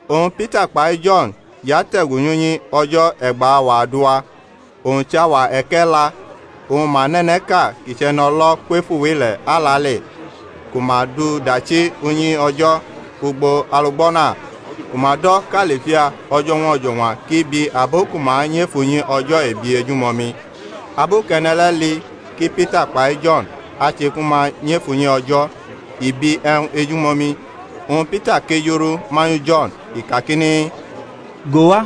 Oñ Pita kpai Jo̩n jʼate̩gu nyʼunyi O̩jo̩ e̩gba auwa adua, owñ chʼauwa e̩ke̩la. Oñ ma nʼe̩ne̩ʼka kʼi chʼe̩no̩lo̩ kwefu wʼile̩ alale, ku ma dʼu dachi unyi O̩jo̩ ugbo alugbo̩na ku ma do̩ kʼAlifia o̩jo̩ñwa o̩jo̩ñwa kʼi bi abo ku ma nyʼef unyi O̩jo̩ ebi ejumomi. Abu kʼe̩ne̩ le̩ li ki Pita kpai Jo̩n ache ku ma nyʼef unyi O̩jo̩, i bi e̩wñ ejumomi. Oñ Pita kejurʼu manyu Jo̩n, i kakini, Go wa.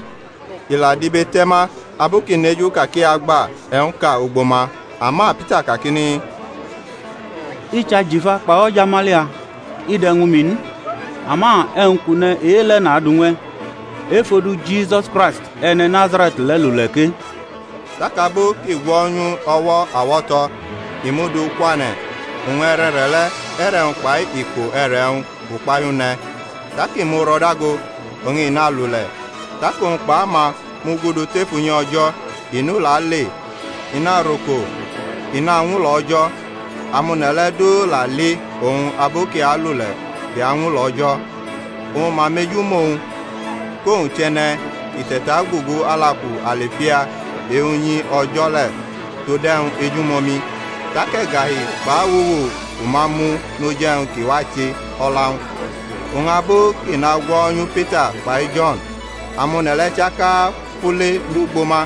I la dibete̩ ma abu kʼi neju ka kʼi agba e̩wñʼka ugbo ma. Ama Pita kakini, I chʼajifa kpai o̩jamalia i de̩ ñwu mi n; ama e̩wñ kʼu ne̩ e-le̩ nadu ñw e̩. Ef odu Jisus Kraisti, e̩ne̩ Nazare̩t le̩, lule̩ ke. Tak abu kʼi gwo̩nyu wñ o̩wo̩ awo̩to̩ i mʼu du kwane̩: oñ e̩re̩re̩ le̩, e̩re̩-wñ kpai iko e̩re̩-wñ fʼukpahiu ne̩. Tak i muro̩ dago, oñ i nalule̩; tak owñ kpaʼama mugudu tef unyi O̩jo̩, i nʼule̩ ale, i naroko, i nañwulo̩ O̩jo̩. Amone̩ le̩ du la li owñ abu kʼi alule̩ kʼi añwulo̩ O̩jo̩. Oñ ma mejumʼowñ, kʼowñ chʼe̩ne̩ ki te̩tagugu alaku Alifia e-unyi O̩jo̩ le̩ tod e̩wñ ejumomi; tak e̩gahi kpʼawuwu fʼuma mu noj e̩wñ ki wa che o̩la-wñ. Oñ abu kʼi nagwo̩nyu Pita kpai Jo̩n, amone̩ le̩ chaka fule nyʼugbo ma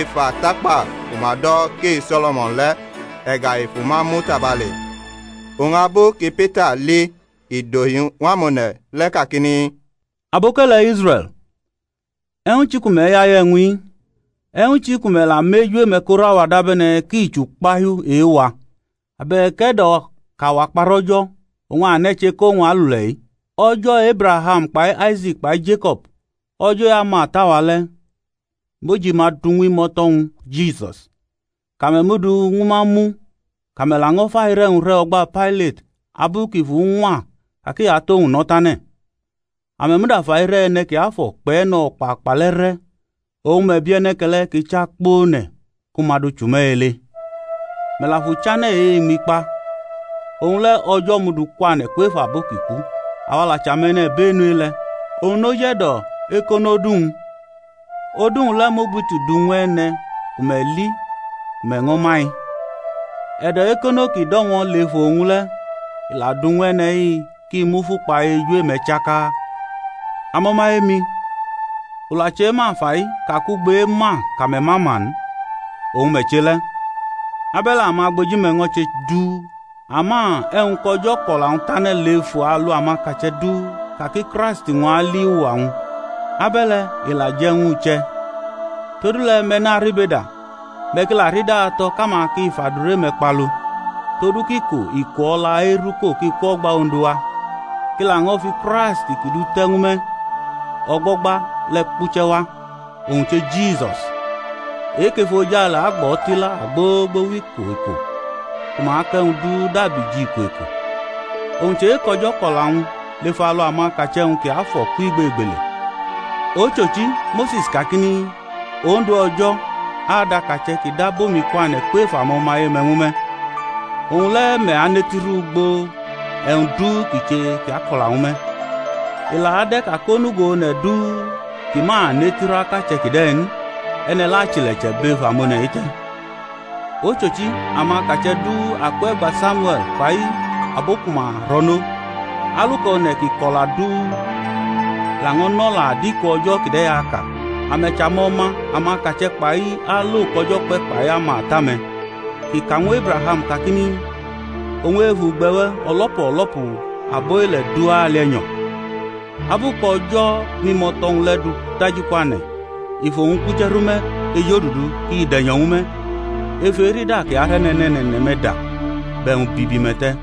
ef atakpa ku ma do̩ kʼe-So̩lo̩mo̩n le̩, e̩gahi fʼuma mu tabale. Oñ abu ki Pita li i dʼohi ñw amone̩ le̩ kakini, Aboke̩le̩ Israe̩l, e̩wñ chi ku me̩ yaye e̩wñ-i? e̩wñ chi ku me̩ la mʼeju-me̩ korʼawa dabe̩ne̩ ki chʼukpahiu e-wa, abe̩k e̩do̩ kʼawa kparʼO̩jo̩ oñ a ne̩ che kʼowñ alule̩-i? O̩jo̩ Ebraham kpai Aise̩k kpai Jeko̩b, O̩jo̩ e-amata-wa le̩, mʼojima du ñw imo̩to̩-wñ Jisus kʼame̩ mʼu du ñw ma mu, kʼame̩ laño̩ fʼaire̩-wñ re̩ o̩gba Pailat abu kʼi fuñwa ka kʼi atʼowñ no̩ tane̩. Ame̩ muda fʼaire̩ E̩ne̩ Kiafo̩ kpʼE̩no̩kpakpa le̩ re̩, oñ me̩ bi e̩ne̩ke̩le̩ ki chʼakpone̩ ku ma du chʼume̩ ele. Me̩ la fʼUchane̩ e-iñmi kpa; owñ le̩ O̩jo̩ mʼu du kwane̩ kwef abo ki ku; awa la chʼame̩-nibenu e-le̩. Oñ noj e̩do̩ ekonʼodu-wñ, odu-wñ le̩ mʼugbiti du ñw e̩ne̩ ku me̩ li ku me̩ ño̩ ma-i. E̩do̩ eko̩no ki do̩mo̩ lef owñ le̩ la du ñw e̩ne̩-i ki mufu kpa eju-me̩ chaka. Amo̩maye-mi, u la chema fai ka kʼugbo ema kʼame̩ ma ma n, oñ me̩ che le̩, abe̩le̩ amagboji-me̩ ño̩ che duu. Ama e̩wñ kʼO̩jo̩ kʼo̩la-wñ tane̩ lef alu amakache̩ du ka ki Kraisti-wñ a li uwa-wñ, abe̩le i la je̩ ñw u che̩. Todule̩ me̩ naribeda, me̩ ki la rida to̩ kʼama ki fʼadure-me̩ kpalu, todu kʼiko iko o̩la eruko ki kwʼo̩gba Ondu wa: kʼi laño̩ fi Kraisti kʼi dute̩ ñw me̩ o̩gbo̩gba le̩ kpuche̩ wa, owñ che Jisus: e-kʼefojale agbʼo̩ tila gbogbo wʼiko iko ku ma kʼe̩wñ du dabi jʼiko iko, owñ chʼe-kʼO̩jo̩ kʼo̩la-wñ lef alu amakache̩-wñ kiafo̩ kwʼigbegbele. Ochochi, Mose̩s kakini, Ondu O̩jo̩ adʼakache̩ kʼi dab omi kwane̩ kwef amo̩maye-me̩ ñwu me̩; owñ le̩ me̩ anetiru ugbo e̩wñ du ki che kʼi ako̩la ñwu me̩. I la ade̩ ka kʼonugo one̩ du ki ma anetiru akache̩ kide̩ n, e̩ne̩ le̩ achile̩che̩ bʼef amone̩-i te̩. Ochochi, amakache̩ du akwe̩gba Samiue̩l kpai abo ku ma ro̩nʼo, aluka one̩ ki ko̩la du laño̩ nʼo̩la adiko o̩jo̩ kide̩ aka. Ame̩ chʼamo̩ma amakache̩ kpai alo kʼO̩jo̩ kpe̩ kpai amata-me̩ kʼi ka ñw Ebraham kakini, Oñ ef ugbe̩-we̩ o̩lo̩pu o̩lo̩pu abʼile̩ du ali e̩nyo̩. Abu kʼO̩jo̩ mʼimo̩to̩-wñ le̩ du daji kwane̩ i fʼowñ kpuche̩ rʼume̩ ejodudu kʼi de̩nyo̩ ñwu me̩ ef erida kʼi arʼe̩ne̩ne̩ne̩ne̩-me̩ da bʼe̩wñ bibi-me̩ te̩.